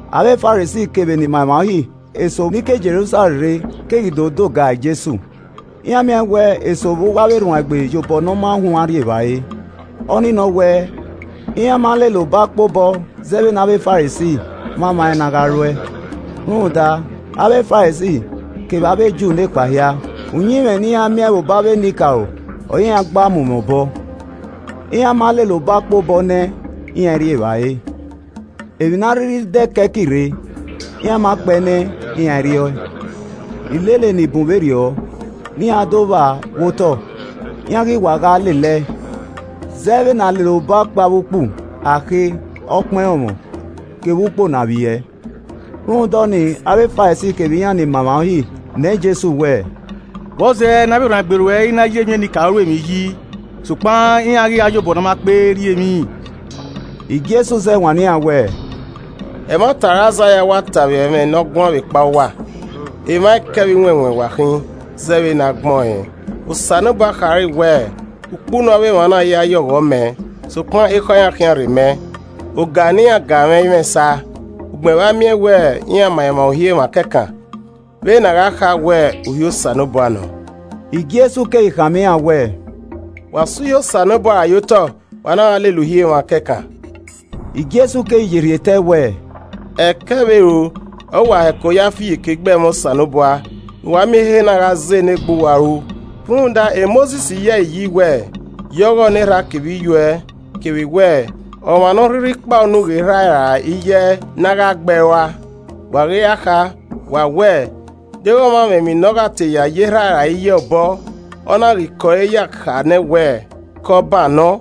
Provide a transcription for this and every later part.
Avbe Farisi kevbe enimaemwa Uhi eso ni ke Jerusalẹm rre keghi do doga Jesu. Iran miẹn wẹ eso vbe uwu avbe erhuanegbe ye obọ “Ne ọ ma huan” rri evbare, ọ ni nọ wẹ iran ma lele ọbakpe obọ zẹ vbe ne avbe Farisi mwamwa ẹn na gha ruẹ. ( Rhunmwuda avbe Farisi kevbe avbe Ju nekpa hia, uyinmwẹ ne iran miẹn vbe obọ avbe enikaro ọre iran gba mu mwẹ obọ, iran ma lele ọbakpe obọ nẹ iran i rri evbare. Emwi ne a rhirhi dẹ ke ẹki rre, iran ma kpe ẹe nẹ, iran i rri ọe. Ilele ni bun vberriọ ne iran do vba vbe otọ iran ghi wa gha lele ẹe, zẹ vbene a na lele ọbakpe avbe ukpu, akhe, ọkpan ẹrọnmwọ kevbe ukpo ne a vbiẹ.) Rhunmwuda ọnii avbe Farisi kevbe iran ni ma emwa Uhi nọọn Jesu wẹẹ, “Vbọzẹ ne avbe erhuanegbe ruẹ i na ya ẹmwẹ enikaro ru emwi yi, sokpan iran ghi gha ya obọ ne a ma kpe rri emwi?” Jesu zẹ wanniẹn iran wẹẹ, “Ẹmwata ọre Aizaia wa ta vbe ẹmwẹ ne ọ guan vbe ekpa uwa. Emwa ẹkẹ vbe iwẹnwẹn wa khin zẹẹ vbene ọ gbẹn ọẹn. “ ‘Osanobua khare wẹẹ, Ukpunu avbe emwa na ya ye ọghọ mẹ, sokpan ekhọe iran khian rrei mẹ. Ọga ne iran ga mwẹ i mwẹ esa, ugbẹn vbe a miẹn wẹ iran ma emwa Uhi emwa kẹkan, vbene a gha kha wẹ uhi Osanobua nọ!’” Jesu keghi khama iran wẹẹ, “Wa sẹ uhi Osanobua rae ye otọ, wa na gha lele uhi emwa kẹkan.” Jesu keghi ye rhie tẹe wẹẹ, “Ẹkẹ vbe ero ọre uwa hẹko ya fi iyeke gbe ẹmwẹ Osanobua, ne uwa miẹn ehe na gha zẹ ne egbe uwa ru. Rhunmwuda Mosis yi ẹre iyi wẹẹ, ‘Ya ọghọ ne erha kevbe iyuẹ,’ kevbe wẹ, ‘Ọmwa ne ọ rhirhi kpa unu ghe erha ẹe ra iye ẹe ne a gha gbe ẹe rua.’ Wa ghi ra kha, wa wẹẹ, ‘Deghẹ ọmwa mwẹ emwi ne ọ gha te ya ye erha ẹe ra iye ẹe obọ, ọ na ghi kẹ ọre ya kha nẹ wẹ, Kọban nọ’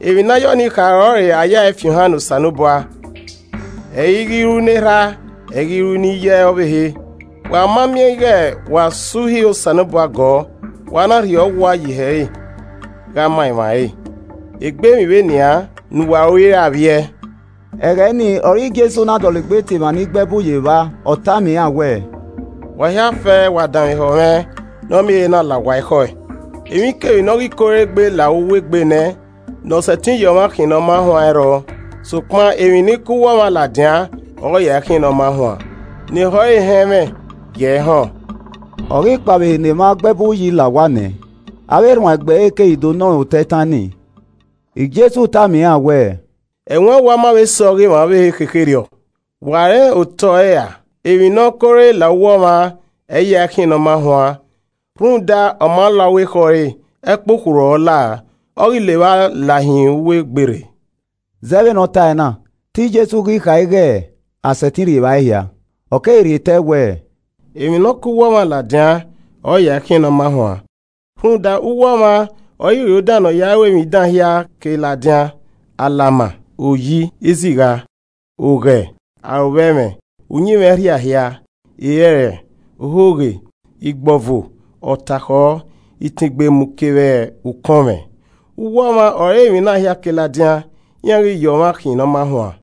(emwi ne a ya ọnii kha ọrọre, a yae fi ohan ne Osanobua.) Ẹ i ghi ru ne erha, ẹ i ghi ru ne iye ọvbehe. Wa ma miẹn ighe wa so uhi Osanobua gọọ, wa na rhie ọ wua ye ihe ẹre gha ma emwa ẹre. Egbe emwi vbe nian ne uwa ru i re avbiẹ.” Ẹghẹ ni ọre Jesu na dọlegbe tie emwa ni gbe ẹbu ye evba, ọ tama iran wẹẹ, “Wa hia fẹẹrẹ wa danmwehọ mwẹ ne ọ miẹn ehe na la uwa ekhọe. Emwikemwi ne ọ ghi ke ore egbe la uwu egbe nẹ, ne ọ sẹtin ya ọmwa khian ne ọ ma huan ẹ i rrọọ, sokpan emwi ni ke uwu ọmwa ladian ọre ọ ya ẹe khian ne ọ ma huan. [ Ne ehọ re họn ẹmwẹ, gi ẹe họn.]” Ọ ghi kpao vbe ehe ne emwa gbe ẹbu yi la owa nẹ, avbe erhuanegbe ẹre keghi do nọ rẹn otọ itan nii. Jesu tama iran wẹẹ, “Ẹwaẹn uwa ma vbe sẹ ọghe emwa ọvbehe khekherriọ. Wa rẹn otọ ẹre ra? Emwi ne ọ ke ore la uwa ọmwa, ẹ i ya ẹe khian ne ọ ma huan. Rhunmwuda, ọ ma la uwu ekhọe ẹre, ẹkpokhurhu ọre ọ lao, ọ ghi levba hin uwu egbe rre.” [Zẹ vbe ne ọ tae na, te Jesu ghi kha ighe a sẹtin rri evbare hia.] Ọ keghi rhie tẹe wẹẹ, “Emwi ne ọ ke uwu ọmwa ladian ọre ọ ya ẹe khian ne ọ ma huan. Rhunmwuda, uwu ọmwa ọre iro dan ne ọ ya ẹe ru emwi dan hia ke ladian, alama, oyi, izigha. Oghẹ, arovbẹmwẹ, uyinmwẹ ẹrhia hia, erẹrẹ, ohoghe, igbọvo, ọtakhọ, itengbemu kevbe ukọnmwẹ. Uwu ọmwa ọre emwi na hia ke ladian, iran ghi ya ọmwa khian ne ọ ma huan.”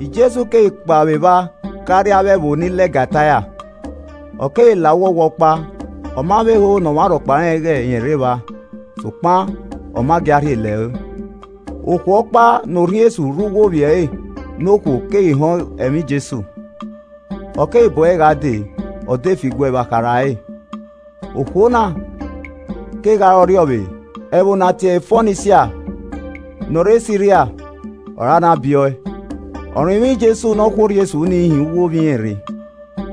Jesu keghi kpao vbe evba gha rrie avbe ẹvbo ni lẹga Taia. Ọ keghi la uwu owa ọkpa, ọ ma vbe ho ne ọmwa rhọkpa rẹn ighẹ rẹn rre evba, sokpan ọ ma gia rhie lẹre. Okhuo ọkpa ne orhiọn esu rre uwu ovbi ẹre ne okhuo keghi họn ẹmwẹ Jesu, ọ keghi bu ẹre gha dee, ọ de fi iguẹ vbe akharha ẹre. Okhuo na kegha re ọrriọvbe, ẹvbo ne a tiẹre Fonisia ne ọ rre Siria ọre a na biẹ ọe. Ọ rinmwian Jesu ne ọ khu orhiọn esu nii hin uwu ovbi irẹn rre.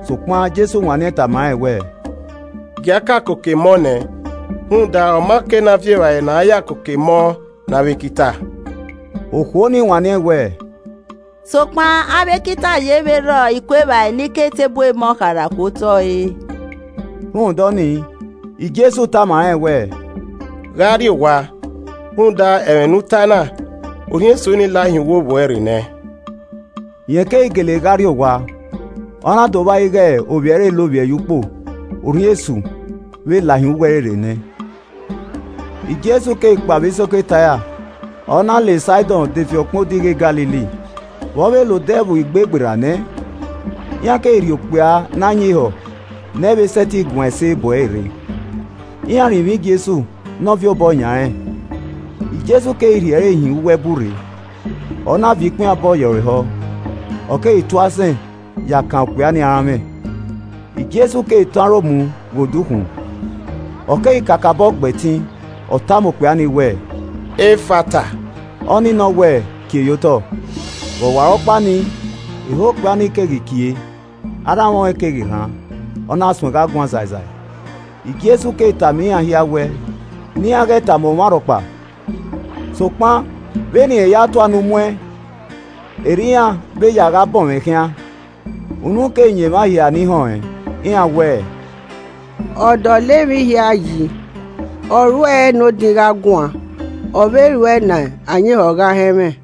Sokpan Jesu wanniẹn tama rẹn wẹẹ, “Gia ka koko emọ nẹ, rhunmwuda ọ ma kei ne a viọ evbare ne a ya koko emọ ne avbe ekita.” Okhuo nii wanniẹn wẹẹ, “Sokpan avbe ekita ye vbe rhọ iku evbare ni ke eteburu emọ kharha ku otọ re.” Rhunmwuda ọnii Jesu tama rẹn wẹẹ, “Gha rrie owa, rhunmwuda ẹmwẹ ne u tae na, orhiọn esu ni lahin uwu ovbi uẹ rre nẹ.” Rẹn keghi gele gha rrie owa, ọ na do vba ighe ovbi ẹre lovbiẹ ye ukpo, orhiọn esu vbe lahin uwu ẹre rre nẹ. Jesu keghi kpao vbe isoko Taia, ọ na la Saidọn defi ọkpẹn odighi e Galili vbe ọ la Odẹ Ẹvbo Igbe gberra nẹ. Iran keghi rhie okpia ne ayin ehọ ne ẹ i vbe sẹtin guan ẹse bu ẹre rre, iran rinmwian Jesu ne ọ viọ obọ yan rẹn. Jesu keghi rhie ẹre hin uwu ẹbu rre, ọ na viọ ikpinhianbọ ye ẹre ehọ, ọ keghi tu asẹn ya kan okpia ni aranmwẹ. Jesu keghi tọn aro mu ghe odukhunmwu, ọ keghi kakabọ gbẹtin, ọ tama okpia ni wẹẹ, “Ephphatha,” ọnii nọ wẹ, “Kie ye otọ.” Vbe ọwarọkpa nii, ehọ okpia ni keghi kie, aranmwẹ ọnrẹn keghi rhan, ọ na suẹn gha guan sai sai. Jesu keghi tama iran hia wẹ ne iran ghẹ tama ọmwa rhọkpa. Sokpan vbene irẹn ya tua unu mu ẹn erriọ iran vbe ya gha bọnmwẹ ọẹn khian. Unu keghi yan emwa hia ni họn ẹn, iran wẹẹ, “Ọ dọlọ emwi hia yi, ọ ruẹe ne odin gha guan ọ vbe ruẹe ne ayin ehọ gha họn ẹmwẹ.”